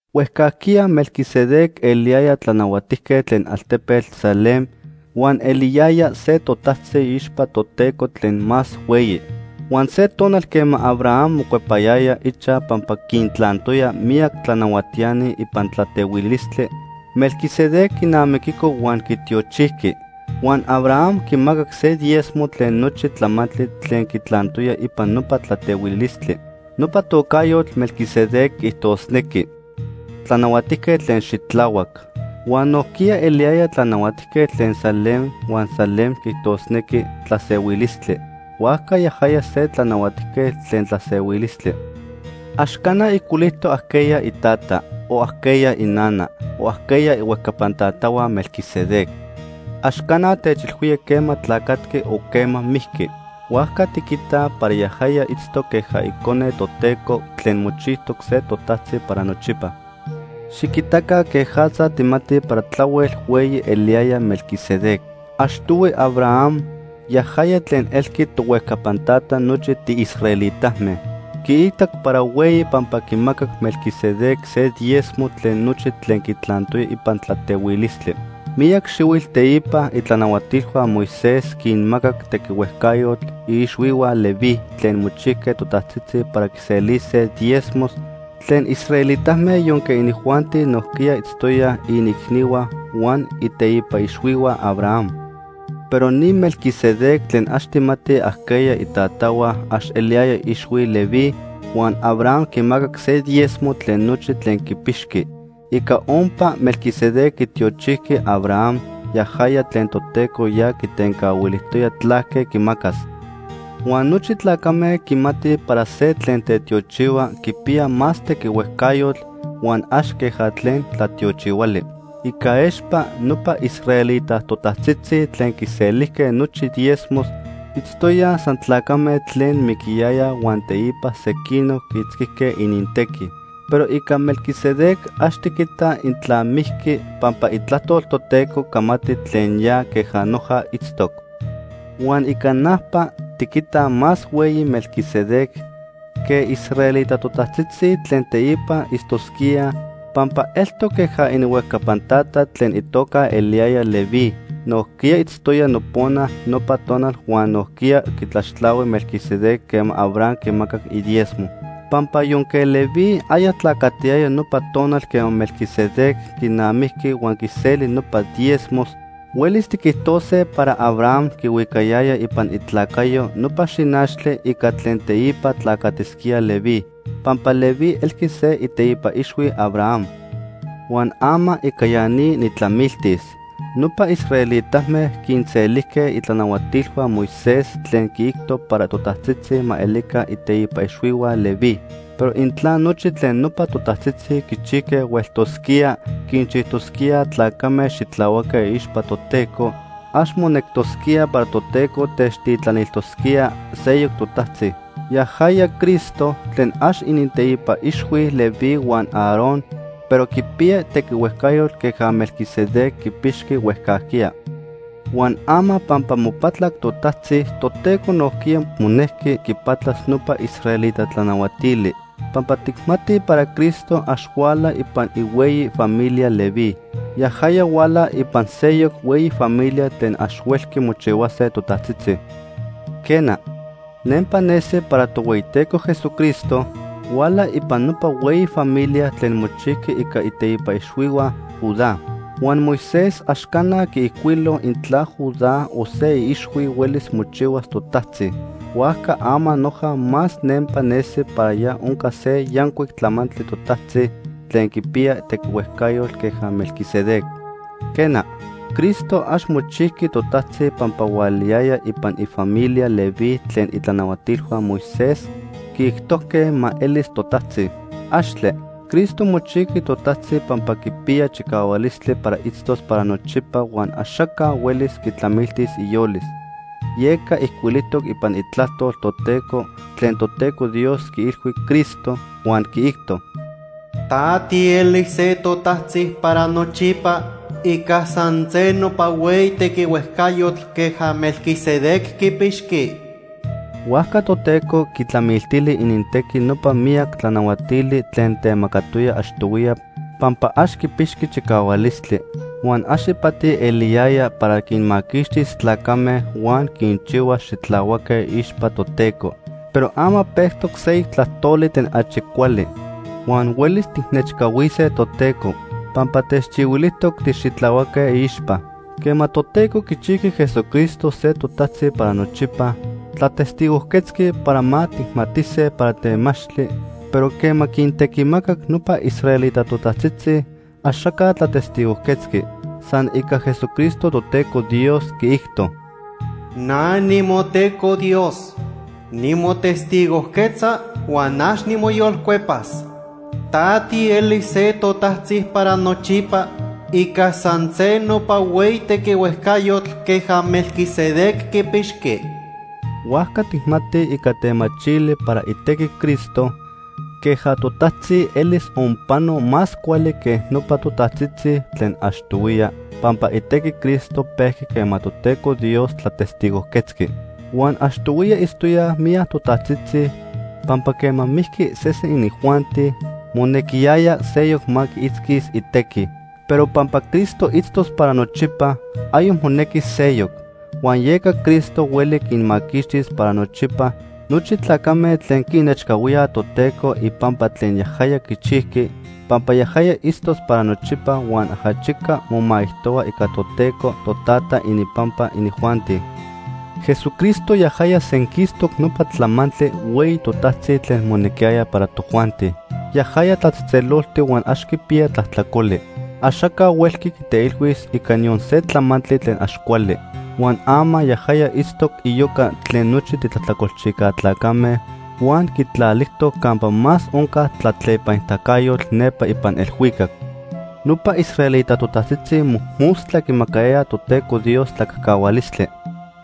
Huejcajquiya Melquisedec eliyaya tlanahuatijquetl tlen altepetl Salem huan eliyaya se totajtzi iixpa Toteco tlen Más Hueyi. Huan se tonal quema Abraham mocuepayaya ichaj pampa quintlantoya miyac tlanahuatiani ipan tlatehuilistli, Melquisedec quinamiquico huan quitiochijqui. Huan Abraham quimacac se diezmo tlen nochi tlamantli tlen quitlantoya ipan nopa tlatehuilistli. Nopa tocajyotl, Melquisedec, quiijtosnequi “tlanahuatijquetl tlen xitlahuac.” Huan nojquiya eliyaya tlanahuatijquetl tlen Salem, huan Salem quiijtosnequi “Tlasehuilistli.” Huajca yajaya se “Tlanahuatijquetl Tlen Tlasehuilistli.” Ax cana ijcuilijtoc ajqueya itata, o ajqueya inana, o ajqueya ihuejcapan tatahua Melquisedec. Ax cana techilhuía quema tlacatqui o quema mijqui. Huajca tiquitaj para yajaya itztoc queja Icone Toteco tlen mochijtoc se totajtzi para nochipa. Xiquitaca quejatza tijmatij para tlahuel hueyi eliyaya Melquisedec. Achtohui Abraham, yajaya tlen elqui tohuejcapan tata nochi tiisraelitame, quiitac para hueyi pampa quimacac Melquisedec se diezmo tlen nochi tlen quitlantoya ipan tlatehuilistli. Miyac xihuitl teipa itlanahuatilhua Moisés quinmacac tequihuejcayotl iixhuihua Leví tlen mochijque totajtzitzi para quiselise diezmos tlen israelitame yonque inijuanti nojquiya itztoyaj iniicnihua huan iteipa ixhuihua Abraham. Pero ni Melquisedec tlen ax tijmatij ajqueya itatahua ax eliyaya iixhui Leví, huan Abraham quimacac se diezmo tlen nochi tlen quipixqui. Ica ompa, Melquisedec quitiochijqui Abraham, yajaya tlen Toteco ya quitencahuilijtoya tlaque quimacas. Huan nochi tlacame quimatij para se tlen tetiochihua quipiya más tequihuejcayotl huan ax queja tlen tlatiochihuali. Ica expa, nopa israelita totajtzitzi tlen quiselijque nochi diezmos itztoyaj san tlacame tlen miquiyayaj huan teipa sequinoc quiitzquijque inintequi. Pero ica Melquisedec ax tiquitaj intla mijqui, pampa Itlajtol Toteco camati tlen ya queja noja itztoc. Huan ica najpa, tiquitaj más hueyi Melquisedec que israelita totajtzitzi tlen teipa itztosquíaj pampa eltoc queja ininhuejcapan tata tlen itoca eliyaya Leví, nojquiya itztoya nopona nopa tonal huan nojquiya quitlaxtlahui Melquisedec quema Abraham quimacac idiezmo. Pampa yonque Leví aya tlacatiyaya nopa tonal quema Melquisedec quinamijqui huan quiseli nopa diezmos, huelis tiquijtose para Abraham quihuicayaya ipan itlacayo nopa xinachtli ica tlen teipa tlacatisquía Leví, pampa Leví elqui se iteipa ixhui Abraham. Huan ama ica ya ni nijtlamiltis. Nopa israelitame quinselijque itlanahuatilhua Moisés tlen quiijto para totajtzitzi ma elica iteipa ixhuihua Leví. Pero intla nochi tlen nopa totajtzitzi quichijque hueltosquía quinchijtosquíaj tlacame xitlahuaque iixpa Toteco, ax monectosquía para Toteco techtitlanilijtosquía seyoc totajtzi, yajaya Cristo, tlen ax ininteipa ixhui Leví huan Aarón, pero quipiya tequihuejcayotl queja Melquisedec quipixqui huejcajquiya. Huan ama pampa mopatlac totajtzi, Toteco nojquiya monejqui quipatlas nopa israelita tlanahuatili, pampa tijmatij para Cristo ax huala ipan ihueyi familia Leví. Yajaya huala ipan seyoc hueyi familia tlen ax huelqui mochihuase totajtzitzi. Quena, nempa nesi para Tohueyiteco Jesucristo huala ipan nopa hueyi familia tlen mochijqui ica iteipa ixhuihua Judá. Huan Moisés ax cana quiijcuilo intla Judá o se iixhui huelis mochihuas totajtzi. Huajca ama noja más nempa nesi para ya onca se yancuic tlamantli totajtzi tlen quipiya tequihuejcayotl queja Melquisedec. Quena, Cristo ax mochijqui totajtzi pampa hualayaya ipan ifamilia Leví tlen itlanahuatilhua Moisés quiijtojque ma elis totajtzi. ¡Axtle! Cristo mochijqui totajtzi pampa quipiya chicahualistli para itztos para nochipa huan axaca huelis quitlamiltis iyolis, yeca ijcuilijtoc ipan Itlajtol Toteco tlen Toteco Dios quiilhui Cristo, huan quiijto: “Ta tielis se totajtzi para nochipa ica san se nopa hueyi tequihuejcayotl queja Melquisedec quipixqui.” Huajca Toteco quitlamiltili inintequi nopa miyac tlanahuatili tlen temacatoya achtohuiya pampa ax quipixqui chicahualistli, huan ax ipati eliyaya, para quinmaquixtis tlacame huan quinchihuas xitlahuaque iixpa Toteco. Pero ama pejtoc seyoc tlajtoli tlen achi cuali huan huelis tijnechcahuise Toteco pampa techchihuilijtoc tixitlahuaque iixpa. Quema Toteco quichijqui Jesucristo se totajtzi para nochipa, tlatestigojquetzqui para ma tijmatise para temachtli, pero quema quintequimacac nopa israelita totajtzitzi, axaca tlatestigojquetzqui. San ica Jesucristo Toteco Dios quiijto: “Na nimoTeco Dios. Nimotestigojquetza huan ax nimoyolcuepas: ‘Ta tielis se totajtzi para nochipa ica san se nopa hueyi tequihuejcayotl queja Melquisedec quipixqui.’” Huajca tijmatij ica temachili para itequi Cristo queja totajtzi elis onpano más cuali que nopa totajtzitzi tlen achtohuiya, pampa itequi Cristo pejqui quema Toteco Dios tlatestigojquetzqui. Huan achtohuiya itztoyaj miyac totajtzitzi, pampa quema mijqui sesen inijuanti, monequiyaya seyoc ma quiitzquis itequi. Pero pampa Cristo itztos para nochipa, ayoc monequis seyoc. Huan yeca Cristo hueli quinmaquixtis para nochipa nochi tlacame tlen quinechcahuíaj Toteco ipampa tlen yajaya quichijqui, pampa yajaya itztos para nochipa huan ajachica momaijtohua ica Toteco Totata ininpampa inijuanti. Jesucristo yajaya senquistoc nopa tlamantli hueyi totajtzi tlen monequiyaya para tojuanti. Yajaya tlatzejtzeloltic huan ax quipiya tlajtlacoli. Axaca huelqui quiteilhuis ica niyon se tlamantli tlen ax cuali. Huan ama yajaya itztoc iyoca tlen nochi titlajtlacolchijca tlacame, huan quitlalijtoc campa más onca tlatlepanitacayotl nepa ipan elhuicac. Nopa israelita totajtzitzi mojmostla quimacayayaj Toteco Dios tlacajcahualistli.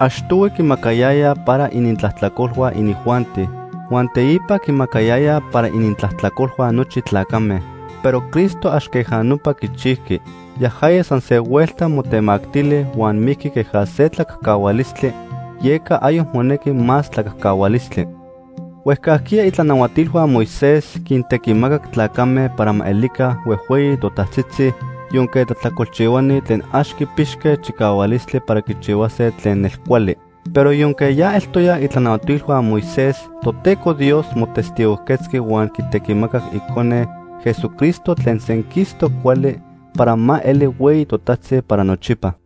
Achtohui quimacayayaj para inintlajtlacolhua inijuanti, huan teipa quimacayayaj para inintlajtlacolhua nochi tlacame. Pero Cristo ax queja nopa quichijqui. Yajaya san se huelta motemactili huan mijqui queja se tlacajcahualistli, yeca ayoc monequi más tlacajcahualistli. Huejcajquiya itlanahuatilhua Moisés quintequimacac tlacame para ma elica huejhueyi totajtzitzi yonque tlajtlacolchihuani tlen ax quipixque chicahualistli para quichihuase tlen nelcuali. Pero yonque ya eltoyaj itlanahuatilhua Moisés, Toteco Dios motestigojquetzqui huan quitequimacac Icone, Jesucristo tlen senquistoc cuali, para ma eli hueyi totajtzi para nochipa.